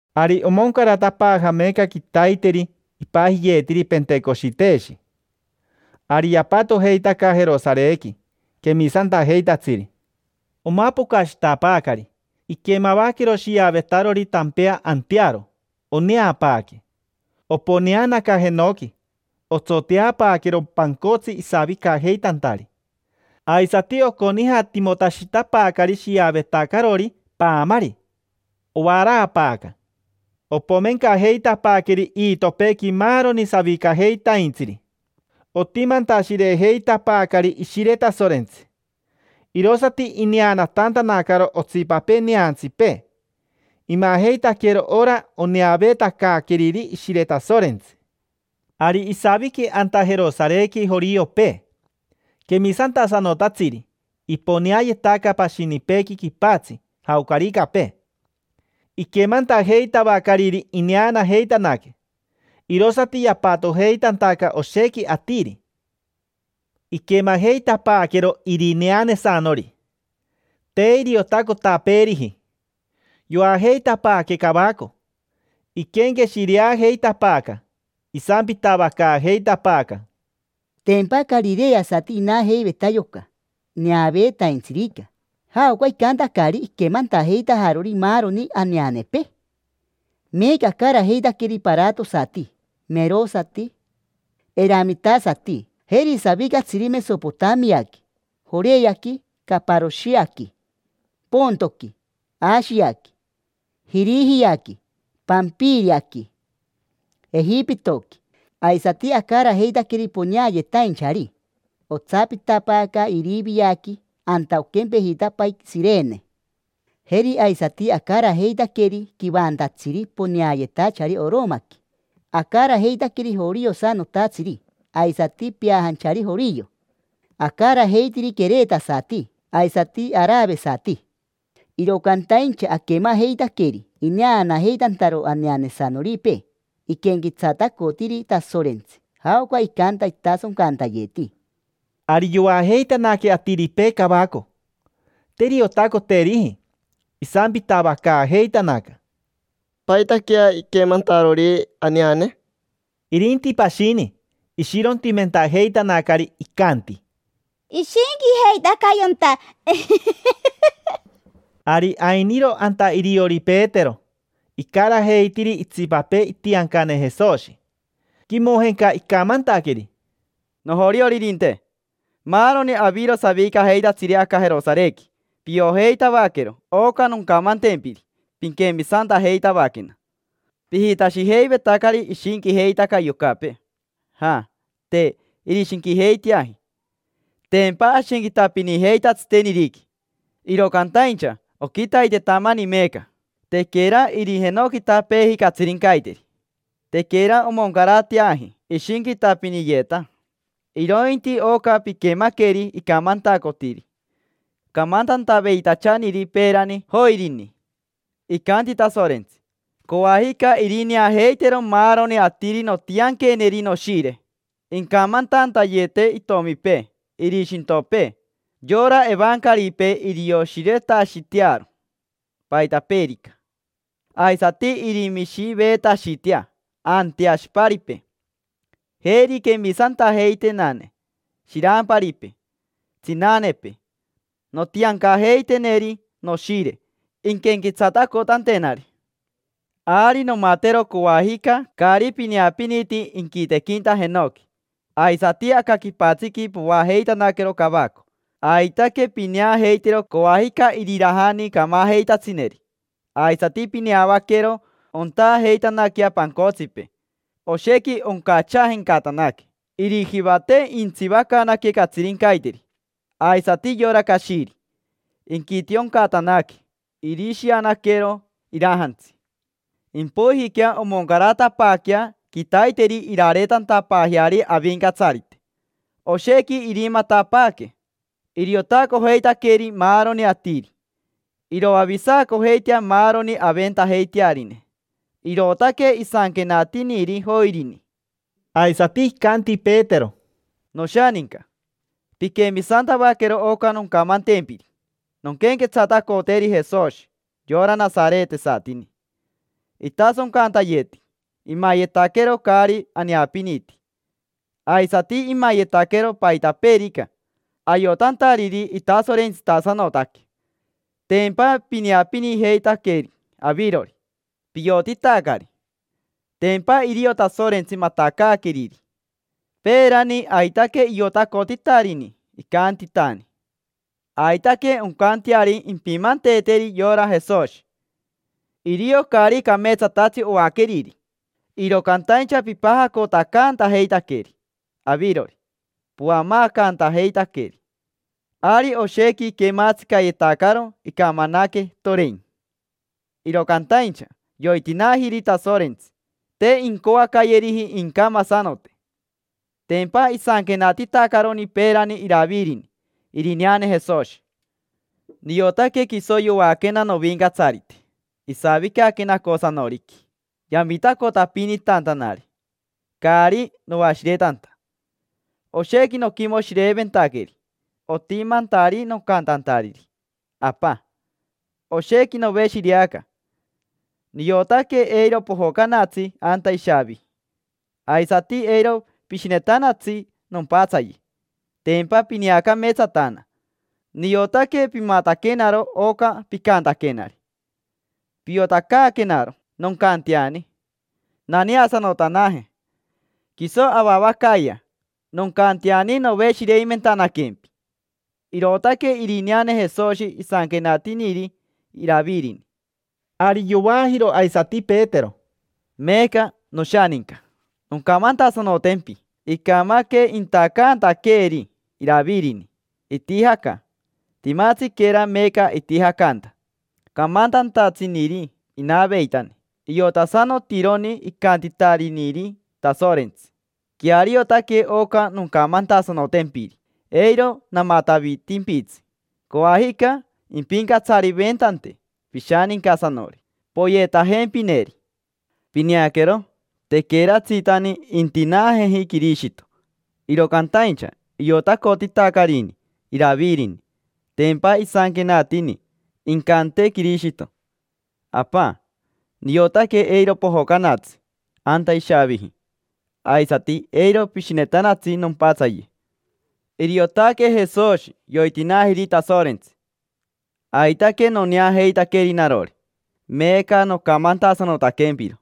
Ari omoncaratapaaja meeca quitaiteri ipajiyeetiri: “Pentecoshiteshi”. Ari yapatojeitaca Jerosarequi quemisantajeitatsiri. Omapocashitapaacari, iquemavaquero shiavetarori tampea antearo, oneapaaque, sooo. Oponeanaca jenoqui, otsoteapaaquero pancotsi isavicajeitantari. Aisati oconijatimotashitapaacari shiavetacarori paamari, ovaraapaaca; opomencajeitapaaqueri iitopeequi maaroni savicajeitaintsiri, pomein. Otimantashirejeitapaacari Ishire Tasorentsi. Irosati ineanatantanacaro otsipapee neantsipee, imajeitaquero ora oneaveetacaaqueriri Ishire Tasorentsi. Ari isaviqui anta Jerosarequi joriopee, quemisantasanotatsiri, iponeayetaca pashinipeequi quipatsi, jaocaricapee. Iquemantajeitavacariri ineanajeitanaque, irosati yapatojeitantaca oshequi atiri. Iquemajeitapaaquero irineanesanori. Te iriotacotapeeriji. Yoajeitapaaque cavaco, iquenqueshireajeitapaaca, isampitavacaajeitapaaca: —Tempa carireasati inajeiveta yoca neaveetaintsirica. ¿Jaoca icantacari iquemantajeitajarori maaroni aneanepee? Meeca acarajeitaqueri paratosati, merosati, eramitasati. Jeri savicatsiri Mesopotamiaqui, Joreaqui, Caparoshiaqui, Pontoqui, Ashiaqui, Jirijiaqui, Pampiriaqui, Ejipitoqui. Aisati acarajeitaqueri poneayetainchari otsapitapaaca Iriviaqui anta oquempejitapai Shirene. Jeri aisati acarajeitaqueri quivantatsiri poneayetachari Oromaqui. Acarajeitaqueri joriosanotatsiri aisati peajanchari jorio. Acarajeitiri queretasati aisati aravesati. Iro cantaincha aquemajeitaqueri ineanajeitantaro aneanesanoripee. Iquenquetsatacotiri Tasorentsi, jaoca icanta itasoncantayeti. Ari yoajeitanaque atiripee cavaco, te iriotacoteriji. Isampitavacaajeitanaca: —¿Paitaquea iquemantarori aneane? Irinti pashini, ishirontimentajeitanacari, icanti: —Ishinquijeitaca yonta, iji, iji, iji. Ari ainiro anta iriori Petero, icarajeitiri itsipapee itiancane Jesoshi. Quimojenca icamantaqueri: —Nojorioririnte: maaroni aviro savicajeitatsiri aca Jerosarequi, piojeitavaquero oca noncamantempiri, pinquemisantajeitavaquena. Pijitashijeivetacari ishinquijeitaca yocapee. Ja, te irishinquijeiteaji. Tempa ashinquitapinijeita tsiteniriqui, iro cantaincha oquitaitetamani meeca, tequera irijenoquitapeeji catsirincaiteri. Tequera omoncarateaji ishinquitapiniyeeta, irointi oca piquemaqueri icamantacotiri camantantaveitachaniri peerani Joirini: “Icanti Tasorentsi: ‘Coajica irineajeitero maaroni atiri nontianqueneri Noshire. Incamantantayete itomipee, irishintopee. Yora evancaripee irioshiretashitearo paitapeerica. Aisati irimishiveetashitea anteashiparipee. Jeri quemisantajeitenane: shiramparipee, tsinanepee, nontiancajeiteneri Noshire, inquenquetsatacotantenari. Ari nomatero coajica caari pineapiniti inquitequinta jenoqui, aisati aca quipatsiqui: poajeitanaquero cavaco. Aitaque pineajeitero coajica irirajani camajeitatsineri, aisati pineavaquero ontaajeitanaquea pancotsipee: oshequi oncachaajencatanaque. Irijivate intsivacanaque catsirincaiteri; aisati yora cashiri, inquitioncatanaque, irishianaquero irajantsi. Impoijiquea omoncaratapaaquea quitaiteri irareetantapaajeari Avincatsarite. Oshequi irimatapaaque, iriotacojeitaqueri maaroni atiri. Iroavisacojeitea maaroni aventajeitearine’”. Irootaque isanquenatiniri Joirini. Aisati icanti Petero: —Noshaninca. Pinquemisantavaquero oca noncamantempiri, nonquenquetsatacoteri Jesoshi, yora nasaretesatini. Itasoncantayeti, imayetaquero caari aneapiniti. Aisati imayetaquero paitapeerica, ayotantariri itasorentsitasanotaque. Tempa pineapinijeitaqueri avirori, piotitacari. Tempa irio Tasorentsi matacaaqueriri. Peerani aitaque iotacotitarini, icantitani: “Aitaque oncanteari, impimanteeteri yora Jesoshi”. Irio caari cameetsatatsi oaqueriri, iro cantaincha pipajacotacantajeitaqueri avirori, poamaacantajeitaqueri. Ari oshequi iquematsicayetacaro, icamanaque, torein. Iro cantaincha yoitinaajiri Tasorentsi, te incoacayeriji incamasanote. Tempa isanquenatitacaroni peerani Iravirini irineane Jesoshi: “Niotaque quiso yoaquena Novincatsarite, isavicaque nacosanoriqui yamitacotapinitantanari, caari noashiretanta. Oshequi noquimoshireventaqueri, otimantari nocantantariri: ‘Apa, oshequi noveshireaca. Niotaque eiro pojocanatsi anta ishaaviji. Aisati eiro pishinetanatsi nompatsaye, tempa pineacameetsatana. Niotaque pimataquenaro oca picantaquenari. Piotacaaquenaro noncanteani naneasanotanaje, quiso avavacayea, noncanteani noveshireimentanaquempi’”. Irootaque irineane Jesoshi isanquenatiniri Iravirini. Ari yovaajiro aisati Petero: —Meeca, noshaninca, noncamantasanotempi. Icamaque intacantaqueeri Iravirini, itijaca. Timatsiquera meeca itijacanta. Camantantatsiniri inaveitani. Iotasanotironi icantitariniri Tasorentsi: “Queariotaque oca noncamantasanotempiri, eiro namatavitimpitsi. Coajica impincatsariventante pishanincasanori, poyetajempineri”. Pineaquero, tequeratsitani intinaajeji Quirishito, iro cantaincha iotacotitacarini Iravirini. Tempa isanquenatini: “Incante Quirishito: ‘Apa, niotaque eiro pojocanatsi anta ishaaviji, aisati eiro pishinetanatsi nompatsaye’”. Iriotaque Jesoshi yoitinaajiri Tasorentsi. Aitaque noneajeitaqueri narori, meeca nocamantasanotaquempiro.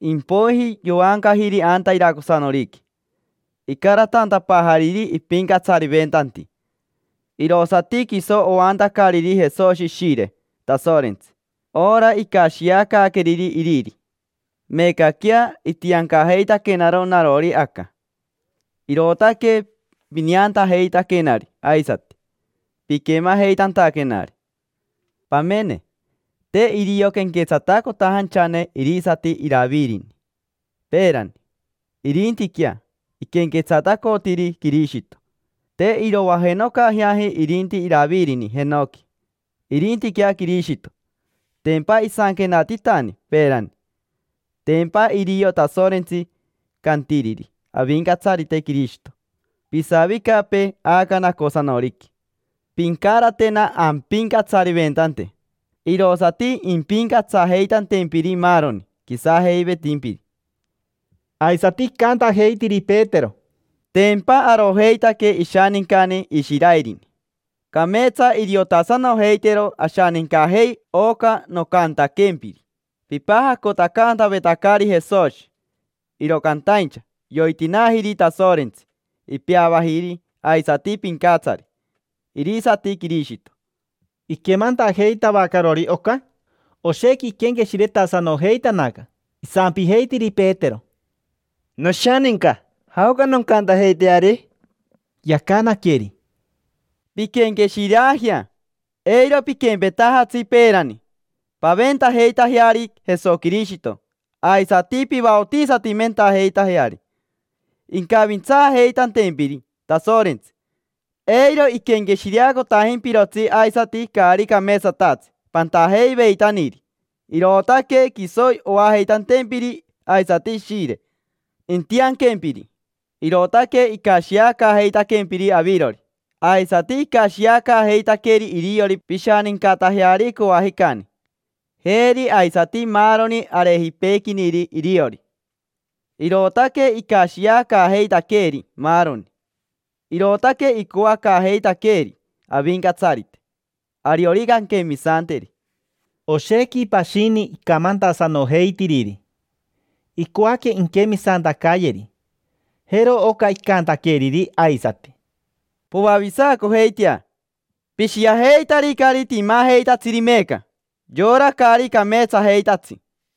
Impoiji yoancajiri anta iracosanoriqui, icaratantapaajariri ipincatsariventanti. Irosati quiso oantacariri Jesoshi Ishire Tasorentsi, ora icashiacaaqueriri Iriri. Meecaquea, itiancajeitaquenaro narori aca: irootaque pineantajeitaquenari aisati piquemajeitantaquenari. Pamene, te irio quenquetsatacotajanchane irisati Iravirini peerani, irintiquea iquenquetsatacotiri Quirishito. Te irovajenocajeaji irinti Iravirini jenoqui, irintiquea Quirishito. Tempa isanquenatitani peerani: “Tempa irio Tasorentsi cantiriri Avincatsarite Quirishito: ‘Pisavicapee aca nacosanoriqui, pincaratena ampincatsariventante irosati impincatsajeitantempiri maaroni quisajeivetimpiri’”. Aisati icantajeitiri Petero: —Tempa arojeitaque ishanincani Ishiraerini. Cameetsa iriotasanojeitero ashanincajei oca nocantaquempiri: pipajacotacantavetacari Jesoshi, iro cantaincha yoitinaajiri Tasorentsi, ipeavajiri aisati Pincatsari, irisati Quirishito. Iquemantajeitavacarori oca, oshequi iquenqueshiretasanojeitanaca. Isampijeitiri Petero: —Noshaninca, ¿jaoca noncantajeiteari? Yacanaqueri: —Pinquenqueshireajea, eiro piquempetajatsi peerani. Paventajeitajeari Jesoquirishito aisati pivaotisatimentajeitajeari, incavintsaajeitantempiri Tasorentsi, eiro iquenqueshireacotajimpirotsi aisati caari cameetsatatsi pantajeiveitaniri. Irootaque quiso oajeitantempiri aisati Ishire intianquempiri. Irootaque icashiacaajeitaquempiri avirori; aisati icashiacaajeitaqueri iriori pishanincatajeari coajicani, jeri aisati maaroni arejipeequiniri iriori. Irootaque icashiacaajeitaqueeri maaroni; irootaque icoacaajeitaqueeri Avincatsarite, ariorica anquemisanteri. Oshequi pashini icamantasanojeitiriri, icoaque inquemisantacayeri. Jero oca icantaqueriri aisati: —Poavisacojeitea. Pishiajeitaricari timajeitatsiri meeca: yora caari cameetsajeitatsi.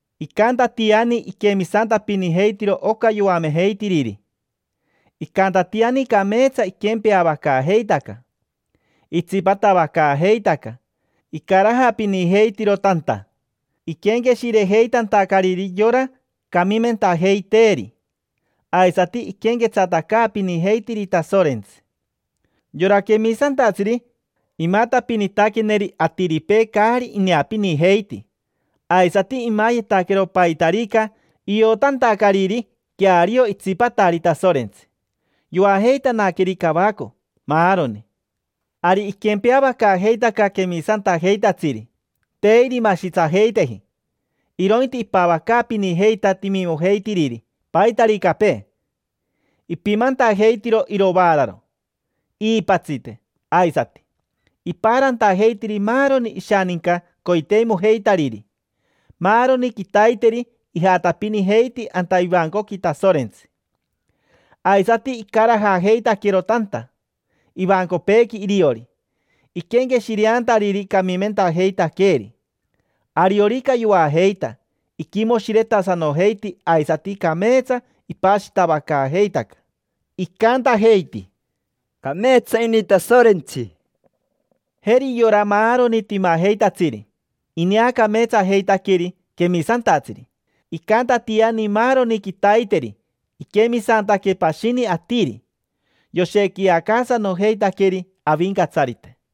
Icantatiani iquemisantapinijeitiro oca yoamejeitiriri. Icantatiani cameetsa iquempeavacaajeitaca: itsipatavacaajeitaca icarajapinijeitiro tanta, iquenqueshirejeitantacariri yora camimentajeiteeri, aisati iquenquetsatacaapinijeitiri Tasorentsi. Yora quemisantatsiri imatapinitaqueneri atiripee caari ineapinijeiti, aisati imayetaquero paitarica iotantacariri queario itsipatari Tasorentsi. Yoajeitanaqueri cavaco maaroni. Ari iquempeavacaajeitaca quemisantajeitatsiri. Te irimashitsajeiteji, irointi ipavacaapinijeita timimojeitiriri, paitaricapee. Ipimantajeitiro irovaararo, iipatsite aisati. Ipaarantajeitiri maaroni ishaninca coiteimojeitariri. Maaroni quitaiteri ijatapinijeiti anta ivancoqui Tasorentsi. Aisati icarajajeitaquero tanta ivancopeequi iriori, iquenqueshireantariri camimentajeitaqueeri. Ariorica yoajeita, iquimoshiretasanojeiti, aisati cameetsa ipashitavacaajeitaca. Icantajeiti: —Cameetsa ini Tasorentsi. Jeri yora maaroni timajeitatsiri ineacameetsajeitaqueri quemisantatsiri. Icantatiani maaroni quitaiteri iquemisantaque pashini atiri, yoshequiacaasanojeitaqueri Avincatsarite.